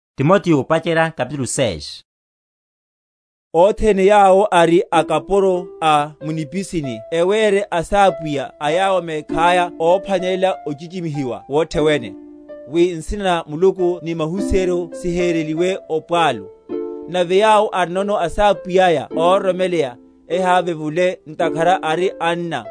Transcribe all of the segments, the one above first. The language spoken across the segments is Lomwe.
Sawaphwanelela akapuro. Othene yawo ari akapuro a mu nipisini ewere asápwiya a yawo mekhaya óphwanelela óchichimihiwa wothe wene, wi nsina na Muluku ni mahusiheryo sihereliwe opwalu. Nave yawo arinono asápwiya óroromela, ehávevule, ntakhara ari anna;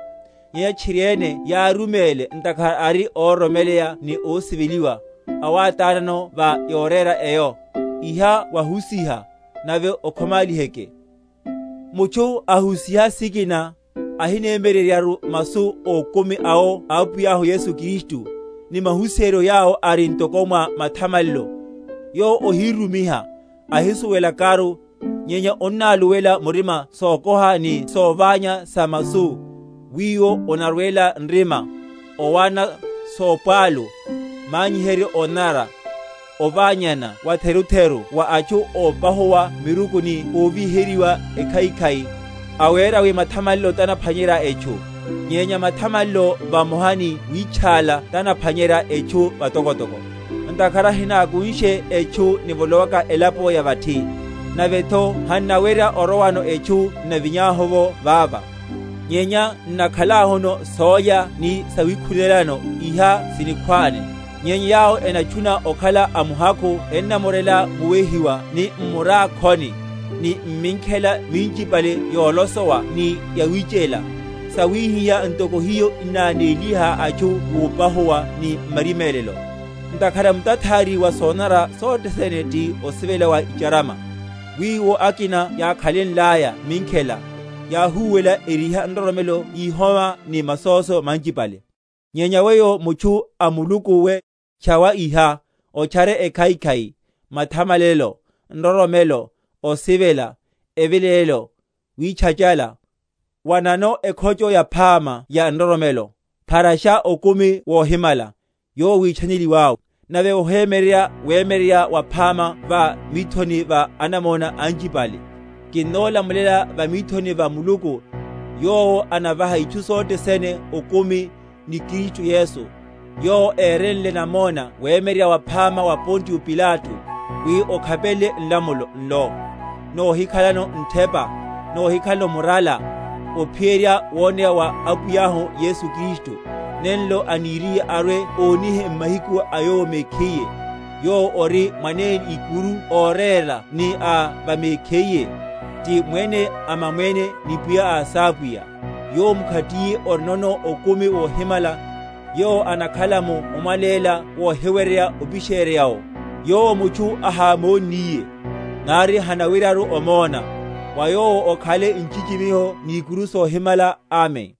nyenya tchiriene yáruméle, ntakhara ari óroromela ni ósiveliwa, awátánano va yorera eyo. Iha wahusiha, nave okhomáliheke. Solopola sikina. Mutchu ahusiha sikina, ahinemyeryeryaru masu ókumi awo a Apwiyahu Yesu Kristu, ni mahusiheryo yawo ari ntoko mwa mathamalelo: yowo ohírumiha, ahisuwelakaru, nyenya onnáluwela murima sokoha ni soványana sa masu, wiwo onarwela nrima, owana, sopwalu, manyiheryo ónanara; oványana watherutheru wa atchu ópahuwa miruku ni óvíheryiwa ekhaikhai, awera wi mathamalelo tanaphwanyerya etchu. Nyenya mathamalelo vamoha ni wítchála tanaphwanyeryaya etchu vatokotoko; ntakhara hinákunshe etchu nivolowaka elapo ya vathi, navetho hannawerya orowano etchu n’navinyahu’vo vava; nyenya n’nakhalahuno sólya ni sawikhunelano, iha sinikhwáne. Nyenya yawo enatchuna okhala amuhakhu ennamorela muwehiwa ni m’murákhoni, ni m’minkhela minchipale yolosowa ni yawichela, sawihiha ntoko hiho inanéliha atchu mupahuwa ni m’marimélelo. Ntakhara mutathári wa sonanara sothe sene ti osivela wa va’charama; wiwo akina yákhalenlaya minkhela, yáhuwela, eriha nroromelo yihoma ni masóso manchipale. Nyenya weyo, mutchu a Muluku we, tchawa iha; otchare ekhaikhai, mathamalelo, nroromelo, osivela, evilelelo, witchachala. Wanano ekhocho yaphama ya nroromelo, pharasha okumi wohimala, yowo wítchaneliwá, nave wohemyeryerya wemyeryerya waphama va mithoni va anamona anchipale. Kinnolamulela va mithoni va Muluku, yowo anavaha itchu sothe sene okumi, ni Kristu Yesu, yowo érenle namona wemyeryerya waphama wa Pontio Pilato; wi okhapelele nlamulo nlo, nohikhalano nthepa, nohikhalano murala, ophiyerya woneya wa Apwiyahu Yesu Kristu; nenlo aniriye arwe‐onihe m’mahiku a Yowo mekhiye, yowo ori Mwanene Ikuru óréla ni a va mekhiye, ti Mwene a mamwene ni Pwiya a asápwiya; Yowo mkhatiye orinono okumi wohimala, yowo anakhala mu omwaléla wohiweryeya opisherya’wo; yowo mutchu ahámonniye, nari hanaweryaru omona; wa Yowo okhale nchichimiho ni ikuru sohimala. Amen.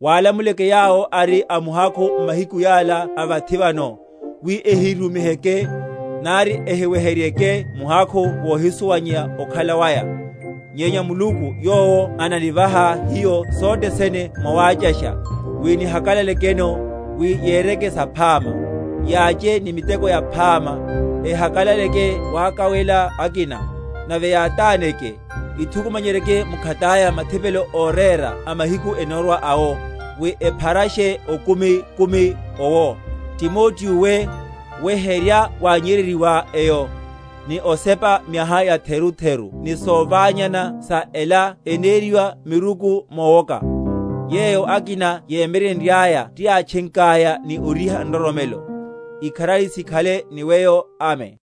Wálamulele yawo ari amuhakhu m’mahiku yala a vathi vano, wi ehirumiheke, nari ehiweheryeryeke muhakhu wohisuwanyeya okhala waya, nyenya Muluku, yowo ananivaha hiyo sothe sene mwawáchasha, wi nihakalalekeno; wi yereke saphama, yáche ni miteko yaphama, ehakalaleke wakawela akina, nave yátáneke; yithukumanyerye mkhataya mathipelo órera a mahiku enórwa awo, wi epharashe okumi‐kumi owo. Timoteo we, weherya wánnyeryeryiwá eyo, ni osepa miaha yatherutharu ni soványana sa ela eneriwa miruku mowoka; yeyo akina yémyeryenryaya tiyátchenkaya ni oriha nroromelo. Ikharari sikhale ni weyo. Amen.